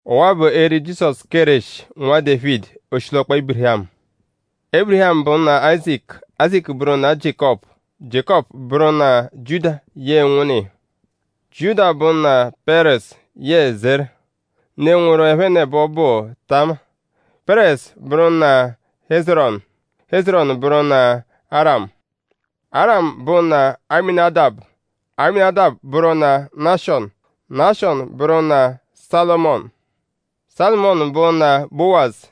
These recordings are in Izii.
Ọwa-a bụ eri Jizọsu Kéreshi, Nwa Dévidi, oshilọkpa Ébirihamu. Ébirihamu bụ nna Áyizaku; Áyizaku bụru nna Jiékọpu; Jiékọpu bụru nna Jiuda yẹe ụnwunna iya. Jiuda bụ nna Pẹ́rezu yẹe Zera. Ne, nwụru ẹphenebo ono bụ Tama. Pẹ́rezu bụru nna Hézerọnu; Hézerọnu bụru nna Arámu. Arámu bụ nna Amínadabu; Amínadabu bụru nna Náshọnu; Náshọnu bụru nna Sálụmonu. Sálụmonu bụ nna Bówazu.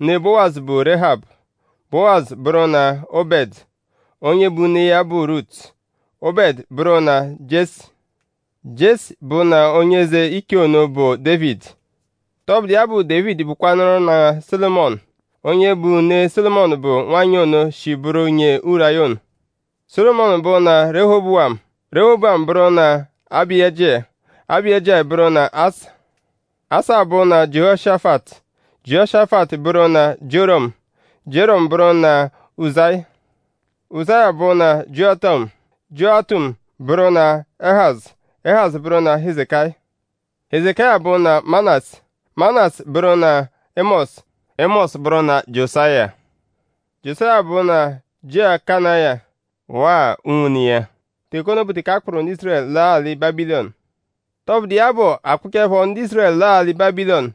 Ne Bówazu bụ Réhabu. Bówazu bụru nna Óbẹdu. Onye bụ ne iya bụ Rutu. Óbẹdu bụru nna Jiesi; Jiesi bụ nna onye eze ichee ono, bụ Dévidi. Tọbudu iya bụ; Dévidi bụkwanuru nna Sólomọnu. Onye bụ ne Sólomọnu bụ nwanyị ono, shi bụru nyee Uráya ono. Sólomọnu bụ nna Rehobówamu; Rehobówamu bụru nna Abáyijia; Abáyijia bụru nna Asa. Asa bụ nna Jiehoshafatu; Jiehoshafatu bụru nna Jióramu; Jióramu bụru nna Uzáya. Uzáya bụ nna Jiótamu; Jiótamu bụru nna Éhazu; Éhazu bụru nna Hezekáya. Hezekáya bụ nna Manásẹ; Manásẹ bụru nna Émọsu; Émọsu bụru nna Jiosáya. Jiosáya bụ nna Jiẹkonáya; waa unwune iya; teke ono bụ teke a kpụkoru ndu Ízurẹlu laa alị Bábilọnu. Tọbudu iya bụ; a kpụkochaepho ndu Ízurẹlu laa alị Bábilọnu: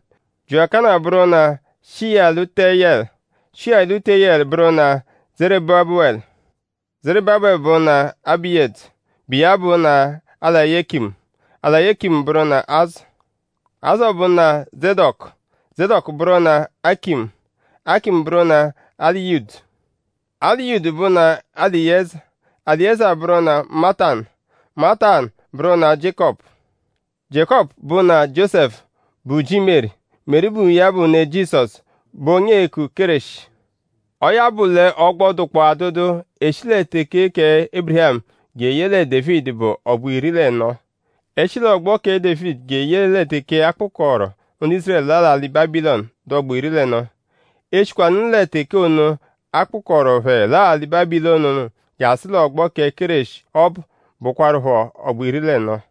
Jiẹkonáya bụru nna Shiyálutiyẹlu; Shiyálutiyẹlu bụru nna Zerúbabelu. Zerúbabelu bụ nna Abíyudu, bụ iya bụ nna Eláyekimu; Eláyekimu bụru nna Azọ. Azọ bụ nna Zédọku; Zédọku bụru nna Ákịmu; Ákịmu bụru nna Éliyudu. Éliyudu bụ nna Eliyéza; Eliyéza bụru nna Mátanu; Mátanu bụru nna Jiékọpu. Jiékọpu bụ nna Jiósẹfu, bụ ji Meri. Meri bụ iya bụ ne Jizọsu, bụ onye eeku Kéreshi. Ọo ya bụ l'ọgbo, dụkpoo adụdu e -shi lẹ teke kẹ Ébirihamu jeye lẹ Dévidi bụ ọgbo iri l'ẹno. E -shi l'ọgbo kẹ Dévidi jeye lẹ teke a kpụkoru ndu Ízurẹlu laa alị Bábilọnu dụ ọgbo iri l'ẹno; e -shikwanụ lẹ teke ono, a kpụkoru phẹ laa alị Bábilọnu ono jasụ l'ọgbo kẹ Kéreshi ọbu bụkwarupho ọgbo iri l'ẹno.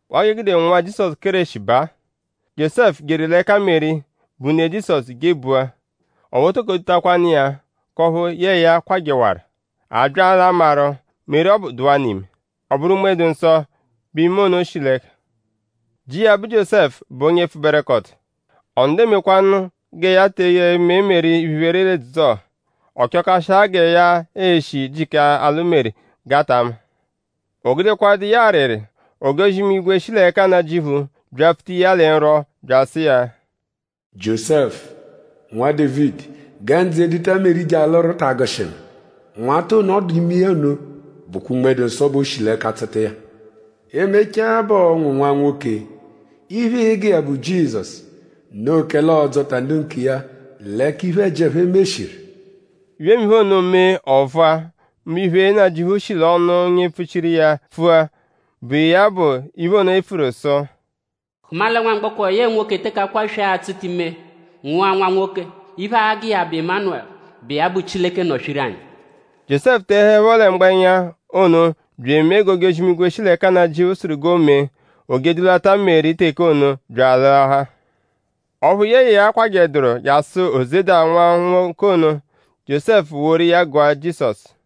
Waa g'e gude nwụa Jizọsu Kéreshi baa: Jiósẹfu jeru l'ẹka Meri, bụ ne Jizọsu jebua. Ọphu o toko dutakwanu iya; k'ọphu yẹe ya kwajẹwaru. A bya l'amarụ; Meri ọbu dụwanu ime. Ọ bụru Unme-dụ-Nsọ bẹ ime ono shi l'ẹka. Ji iya, bụ Jiósẹfu bụ onye pfụberekoto. Ọ nọdu emekwanụ gẹ ya te eme Meri iphe-iphere l'edzudzu-ọha. Ọ chọkashiahaa gẹ ya e-shi jịka alụ Meri g'a ta ma. O gudekwadụ iya arịri; ojozi-imigwe, shi l'ẹka Nnajịuphu byapfuta iya lẹ nrwọ bya asụ iya: “Jiósẹfu; Nwa Dévidi; gẹ ndzụ eduta Meri je alụru ta agụshi ngu. Nwata ono, ọ dụ ime iya ono bụkwa Unme-dụ-Nsọ bẹ o shi l'ẹka tsụta iya. E -mechaa bẹ ọo-nwụ nwa-nwoke. Iphe, ịi-gụ iya bụ Jizọsu. Noo kẹle ọo-dzọta ndu nkiya l'ẹka iphe-ẹji, ẹphe meshiru.” Iphemiphe ono mee ọ vụa; mbụ iphe, Nnajịuphu shi l'ọnu onye mpfuchiru iya pfua, bụ iya bụ iphe ono, e pfuru sụ: “Hụma lẹ nwamgbọko, yẹe nwoke teke akwaswee a-tsụta ime nwụa nwa nwoke; iphe, aa-gụ iya bụ ‘Ịmanelu’, bụ iya bụ ‘Chileke nọ swiru anyi’.” Jiósẹfu tehuẹpho lẹ mgbẹnya ono bya emee g'ojozi-imigwe, shi l'ẹka Nnajịuphu sụru g'o mee. O je edulata Meri teke ono bya alụahaa. Ọphu yẹe ya akwajẹduru jasụ o zeda nwụa nwa nwoke ono. Jiósẹfu woru iya gụa Jizọsu.